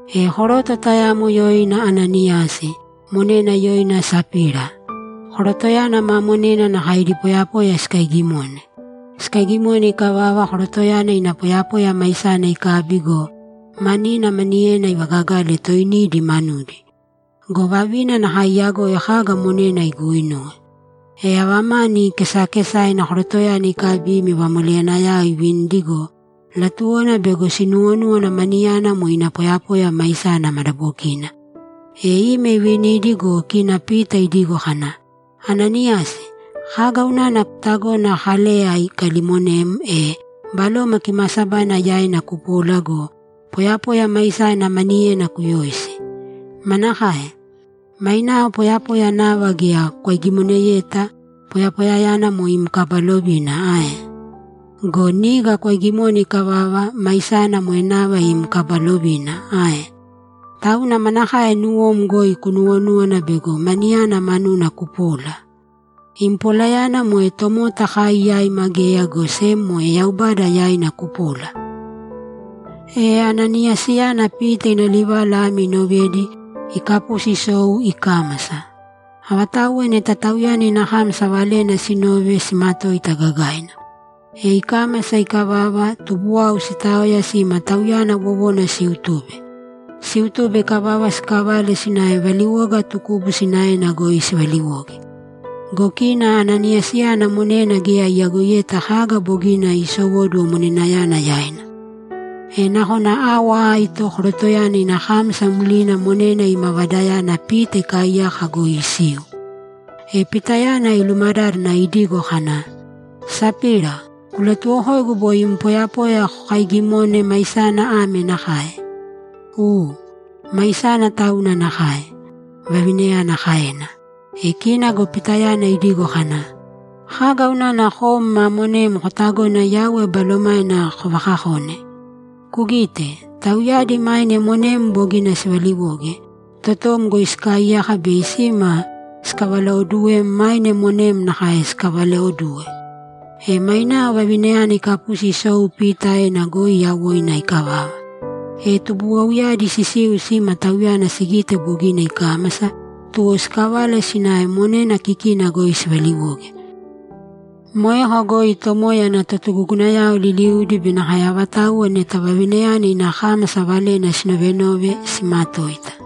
E koroto tayamo yoina Ananiyasi; monena yoina Sapira. Korotoyana ma monena nakae idi poyapoya sikaigimone. Sikaigimone ikavava, korotoyana ina poyapoya maisana ikabi go, manina maniyena ivagagale toinidi manudi. Go vavina nakae iyagoi kaga monena iguinuwe. E ava mani kesakesaina korotoyana ikabi ime vamoleyanayao ivinidi go, latuwona bego sinuwonúwana maniyana moe ina poyapoya maisana madabokina. E ime ivinidi go, kina Pita idigo kana, ‘Ananiyasi, kaga unana kutagona Kaleya ikalimonem, e Baloma Kimaasabaina yaina kupola go, poyapoya maisana maniyena kuyoisi? Manakae? Mainao poyapoya nava geya kwaigimoneyeta, poyapoyayana moe im kaba lovina ae? Go niga kwaigimone ikavava, maisana moe nava im kaba lovina ae? Tauna manakae nuwom goi kunuwonúwana bego maniyana manuna kupola? Im polayana moe tomota kai yaima geya, go sem moe Yaubada yaina kupola!’ E Ananiyasiyana Pita ina livala ame inovedi, ikapusi isou ikámasa. Avatauwa neta tauyana ina kámasa valena sinove, simatoita gagaina. E ikámasa ikavava, tubuwau sitaoya sima tauyana wowona siutube. Siutube ikavava, sikavale sinave valiwoga tukubu sinaena goi sivaliwoge. Go kina Ananiyasiyana monena geya iyagoiyeta kaga bogina isowóduwo monenayana yaina. E nakona awa aito korotoyana ina kámasa mlina monena ima vadayana Pita ikaaiyaka goi isiu. E Pitayana ilumadádana idigo kana, ‘Sapira, kulatuwokōigu boi imi poyapoya kokaigimone, maisana ame nakae?’ ‘U. Maisana tauna nakae’, vavinayana kaena. E kina go Pitayana idigo kana, ‘Kaga unana kom ma monem kotagona Yauwe Balomaina kovakakone? Kugīte, tauyadi maine monem bogina sivaliwoge, totom goi sikaaiyaka bei sima sikavalaoduwem maine monem nakae sikavalaoduwe.’ E mainao vavinayana ikapusi isou Pita aena goi yawoina ikavava. E tubuwauyadi sisiu sima tauyana sigite bogina ikámasa, tuwo sikavale sinave monena kikina goi sivaliwoge. Moeko goi Tomoya ana totugugunayao liliudi be nakae avatauwa neta vavinayana ina kámasa valena sinovenove simatoita.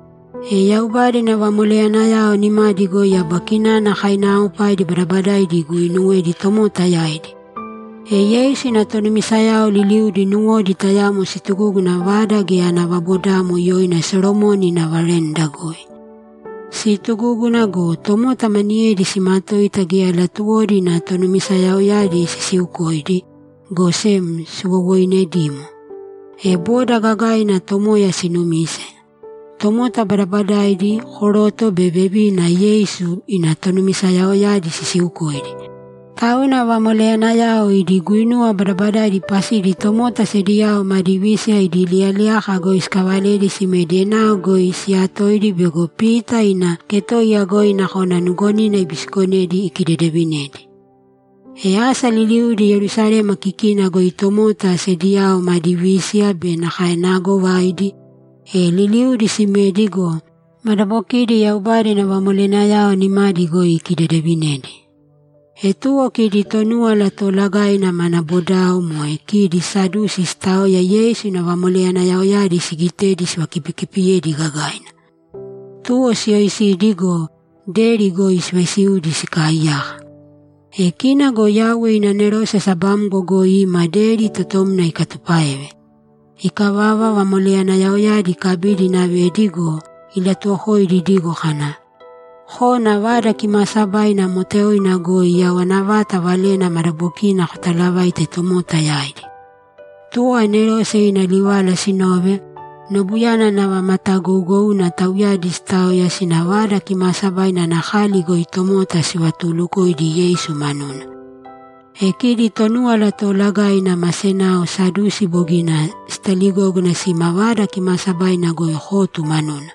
E Yaubada ina vamoleyanayao nimadi goi aba kinana kainaaopaidi badabadaidi iguuinuwedi tomota yaidi. E Yeisu ina tonumisayao liliudi nuwodi tayamo situgúguna vada geya ana vabodamo yoina Solomoni ina veranda goi. Siitugúguna go, tomota maniyedi simatoita, geya latuwodi ina tonumisayaoyadi sisiukoidi, go sem siwowoinedimo. E boda gagaina Tomoya sinumise; tomota badabadaidi, koroto be vevina, Yeisu ina tonumisayaoyadi sisiukoidi. Tauna vamoleyanayao idi guinuwa badabadaidi pasidi tomota sediyao madi vísiya idi liyaliyaka goi sikavaledi simedi enao goi siyatoidi bego Pita ina ketoiya goi nakona nugonina ibisikonedi ikidedevinedi. E asa liliudi Yerusalema kikina goi tomota sediyao madi vísiya be nakae naagovaidi, e liliudi simedi go, madabokidi Yaubada ina vamoleyanayao nimadi goi ikidedevinedi. E tuwo kidi Tonúwala Toolagaina mana bodao, moe kidi Sadusi, sitaoya Yeisu ina vamoleyanayaoyadi sigitedi sivakipikipiyedi gagaina. Tuwo siyoisidi go, deri goi sivaisiudi sikaaiyaka. E kina go Yauwe ina anerose sabamgo goi ima deri totomna ikatupáeve. Ikavava, vamoleyanayaoyadi ikabidi inavedi go, ilatuwokoidi idigo kana, ‘Kōna Vada Kimaasabaina moteoina goi yawana vata valena madabokina kotalavāite tomota yaidi.’ Tuwo anerose ina livala sinove, nobuyana nava matagougouna tauyadi sitaoya sina Vada Kimaasabaina ana kali goi tomota sivatuulukoidi Yeisu manuna. E kidi Tonúwala Toolagaina ma senao Sadusi bogina sitaligógana sima Vada Kimaasabaina goi kotu manuna.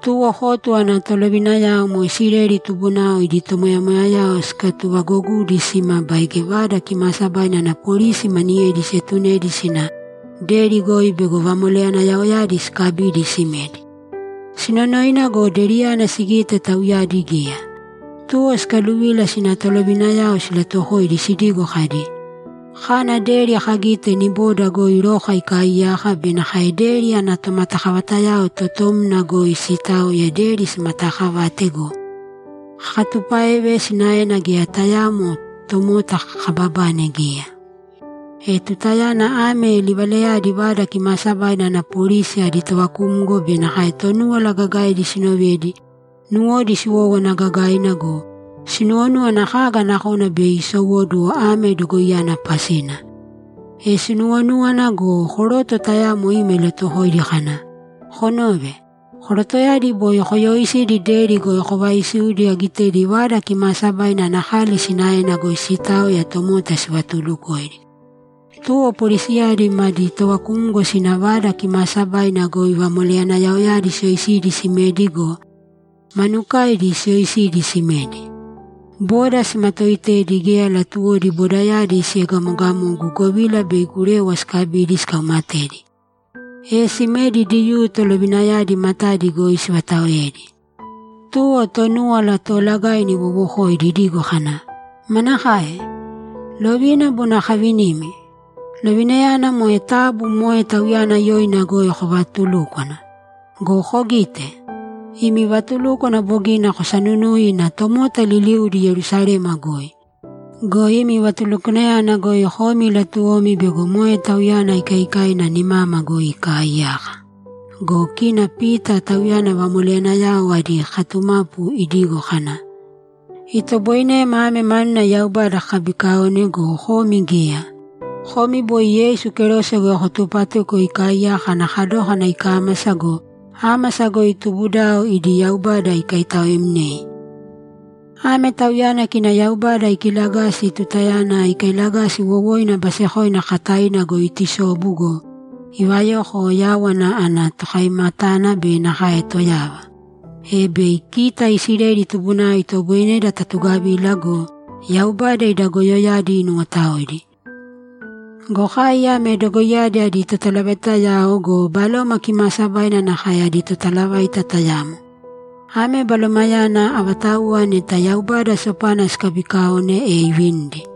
Tuwo kotu ana tolovinayao moe Isileli tubunao idi tomoyamoyayao sikatuvagogudi sima baige Vada Kimaasabaina ana polisi maniyedi sietunedi sina deri goi bego vamoleyanayaoyadi sikabidi simedi. Sinonoina go, deriyana sigite tauyadi geya. Tuwo sikaluvila sina tolovinayao silatuwokoidi sidigo kadi, ‘Kana deri kagite niboda goi roka ikaaiyaka be nakae deri ana tomatakavatayao totomna goi siitaoya deri simataakavate go, kakatupáeve, sinaena geya tayaamo tomota kababane geya.’ E tutayana ame livalayadi Vada Kimaasabaina ana polisi adi tovakumgo be nakae Tonúwala Gagaidi sinovedi, nuwodi siwówana gagaina go, sinuwonúwana kaga nakona bei isowóduwo ame dogoiyana pasina. E sinuwonúwana go, koroto tayamo ima ilatuwokoidi kana, ‘Konōve, korotoyadi boi koyooisidi deri goi kovaisiudi agitedi Vada Kimaasabaina ana kali sinaena goi siitaoya tomota sivatuulukoidi.’ Tuwo polisiyadi madi tovakumgo sina Vada Kimaasabaina goi vamoleyanayaoyadi siyoisidi simedi go, manukaidi siyoisidi simedi. Boda simatooitedi; geya latuwodi bodayadi siegamogamogu, govila bei gurewa sikabidi sikaumatedi. E simedi Diyuu tolovinayadi matadi goi sivataoedi. Tuwo Tonúwala Toolagaina iwowokoidi idigo kana, ‘Manakae? Lovina bogina kavinimi? Lovinayana moe taabu moe Tauyana yoina goi kovaatulūkwana! Go kogīte! Imi vatulúkwana bogina kosanunui ina tomota liliuudi Yerusalema goi! Go imi vatulukwanayana goi komi latuwomi bego moe Tauyana ikaikaina nimama goi ikaaiyaka.’ Go kina Pita, tauyana vamoleyanayao adi katumapu, idigo kana, ‘Itoboinema ame manuna Yaubada kakabikaone go, komi geya. Komi boi Yeisu kerose goi kotupatuko ikaaiyaka ana kadókana ikámasa go, ámasa goi tubudao idi Yaubada ikaitaoemnei. Ame Tauyana kina Yaubada ikilagasi tutayana ikailagasi wowoina basekoina kakataina goi itusobu go, ivayoko Yáwana ana Tokaimatana be nakae Toyava, e bei kita Isileli tubunao itoboineda tatugavila go, Yaubada ida goyoyadi inuwotaoidi. Go kai ame dogoiyadi adi totalavaitayao go, Baloma Kimaasabaina nakae adi totalavaita tayamo. Ame Balomayana, avatauwa neta Yaubada sopana sikabiikaone, e ivinidi.’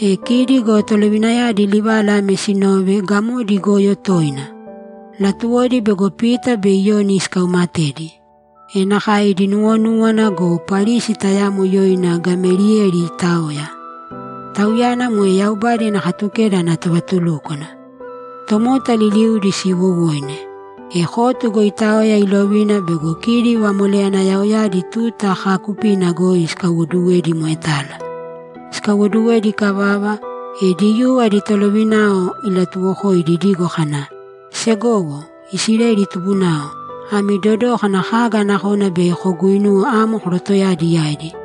E kidi go tolovinayadi livala ame sinove, gamodi igoyo toina; latuwodi bego Pita be Iyoni sikaumatedi. E nakae idi nuwonúwana go, Parisi tayamo yoina Gameliyeli itaoya. Tauyana moe Yaubada ina Katukeda ana tovatulúkwana. Tomota liliudi siiwowoine. E kotu goi itaoya ilovina bego kidi vamoleyanayaoyadi tuta kaakupina goi sikaiwoduwedi moetala. Sikaiwoduwedi ikavava, e Diyuu adi tolovinayao ilatuwokoidi idigo kana, ‘Segowo Isileli tubunao, ami dodōkana kaga nakona bei koguinuwe amo korotoyadi yaidi.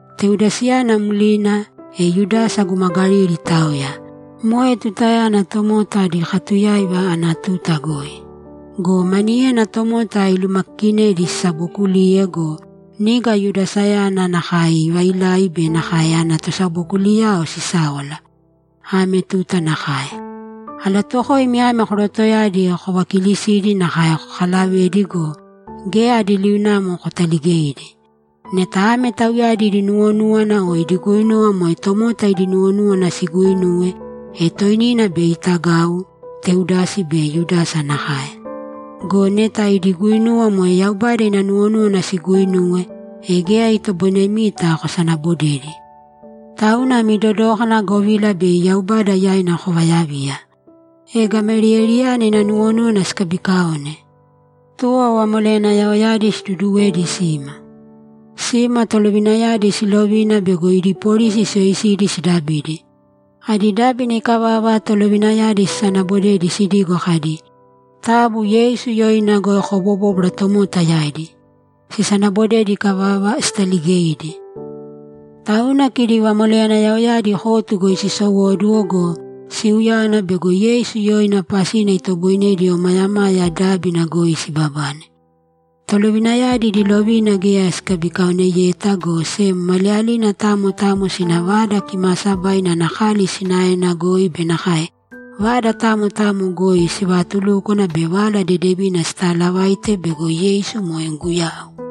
Teudasiyana mlina, e Yudasa guma Galili itaoya. Moe tutayana tomota adi katuyáiva ana tuta goi. Go maniyena tomota ilumakikinedi sisabokuliye go, niga Yudasayana nakae ivailai be nakae ana tosabokuliyao sisáwala. Ame tuta nakae. Alatuwokoimi ame korotoyadi kovakilisīdi nakae kokalavēdi go, geya adi liunamo kotaligeidi. Neta ame tauyadi idi nuwonúwana o idi guinuwa moe tomota idi nuwonúwana siguuinuwe, e toinina bei itagau, Teudasi be Yudasa nakae. Go neta idi guinuwa moe Yaubada ina nuwonúwana siguuinuwe, e geya itoboinemita kosanabodedi. Tauna ami dodōkana, govila bei Yaubada yaina kovayaviya.’ E Gameliyeliyana ina nuwonúwana sikabikaone. Tuwo vamoleyanayaoyadi siduduwedi sima. Sima, tolovinayadi silovina bego idi polisi siyoisidi sidabidi. Adi dábina ikavava, tolovinayadi sisanabodedi sidigo kadi, ‘Taabu Yeisu yoina goi kobobōbwara tomota yaidi!’ Sisanabodedi ikavava, sitaligeidi. Tauna kidi vamoleyanayaoyadi kotu goi sisowóduwo go, siuyáwana bego Yeisu yoina pasina itoboinedi omayamaya dábina goi sibabane. Tolovinayadi idi lovina geya sikabikaoneyeta, go sem maliyalina tamo tamo sina Vada Kimaasabaina ana kali sinaena goi be nakae vada tamo tamo goi sivaatulúkwana be Vala Dedevina sitaalavaite bego Yeisu moe Guyau.